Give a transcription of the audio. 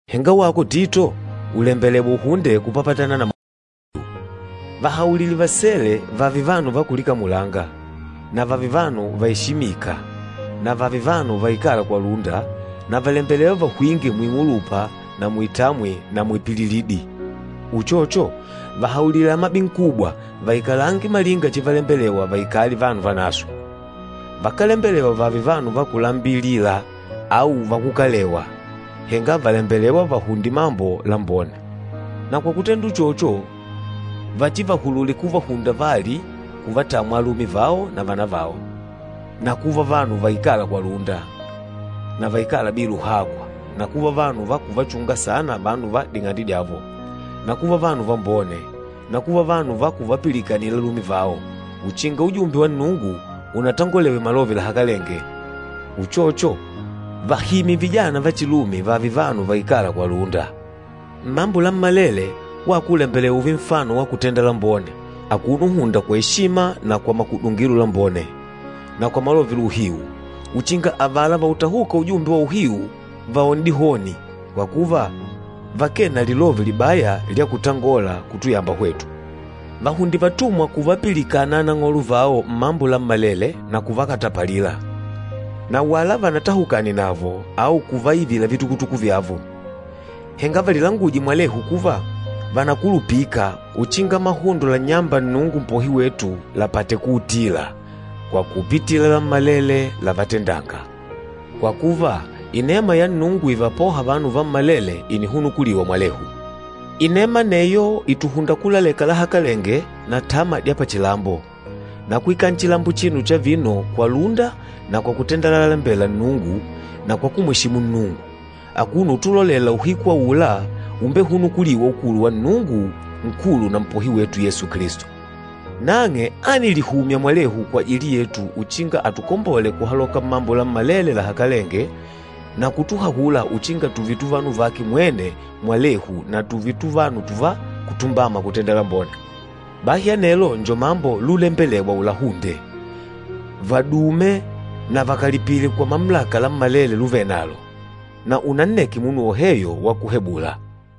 Henga wako Tito, ùlembelewa uhunde kupapatana na mahundo la uhiu. Vahaulile vasele vààve vanu va kulikamulanga, na vààve vanu vaeshimika na vààve vanu vaikâla kwa lúnda, na vàlembelewa vahwinge muing'ulupa na muitamwi na muipililidi. Uchocho, vahaulile amabinkubwa vaikalange malinga chivalembelewa vaikale vanu vanaswe. Vakálembelewa vààve vanu va kulambilila au vakukalewa, henga vàlembelewa vahunde mambo lambone. Na kwa kutenda uchocho, vachivahulule kuvahunda vali kuvatamwa alume vao na vana vao, na kuva vanu vaikâla kwa lúnda, na vaikâla bila uhakwa, na kuva vanu va kuvachunga saana vanu va ding'ande dyavo, na kuva vanu vambone, na kuva vanu va kuvapilikana alume vao, uchinga ujumbe wa Nnungu unatangolewe malove lahakalenge. Uchocho, vahimye vijana vachilume vààve vanu vaikâla kwa lúnda. Mmambo lammalele, wako ùlembelewa ùùve nfano wa kutenda lambone, akuno uhunda kwa eshima na kwa makudungilo lambone, na kwa malove la uhiu, uchinga avala vautahûka ujumbe wa uhiu vaone dihoni, kwa kuva vakee na lilove libaya lya kutangola kutuyamba hwetu. Vahunde vatumwa kuvapilikana anang'olo vao mmambo lammalele na kuvakatapalila, na wala vanatahukane navo, au kuvaivila vitukutuku vyavo. Henga valilanguje mwalehu kuva vànakulupika uchinga mahundo lannyâmba Nnungu Mpohi wetu lapate kuutula, kwa kupitila lammalele lávatendàngà. Kwa kuva, inema ya Nnungu ivapôha vanu vammalele ìnihunukuliwa mwalehu. Inema aneyo ìtuhunda kulaleka lahakalenge na tama dya pachilambo, na kuikala nchilambo achino cha vino kwa lúnda na kwa kutenda lalalembela Nnungu na kwa kumweshimu Nnungu, akuno utulolela uhiku aula úmbehunukulìwà ukulu wa Nnungu Nkulu na Mpohi wetu Yesu Kilisto. Nang'e ánilihumya mwene kwajili yetu uchinga atukombole kuhaloka mmambo lammalele lahakalenge na kutuhahula uchinga tùùve tuvanu vake mwene mwalehu na tùùve tuvanu tùvá kutumbama kutenda lambone. Bahi anelo njo mambo lulembelewa ulahunde. Vadume na vakalipile kwa mamulaka lammalele luvenalo, na unanneke munu woheyo wakuhebula.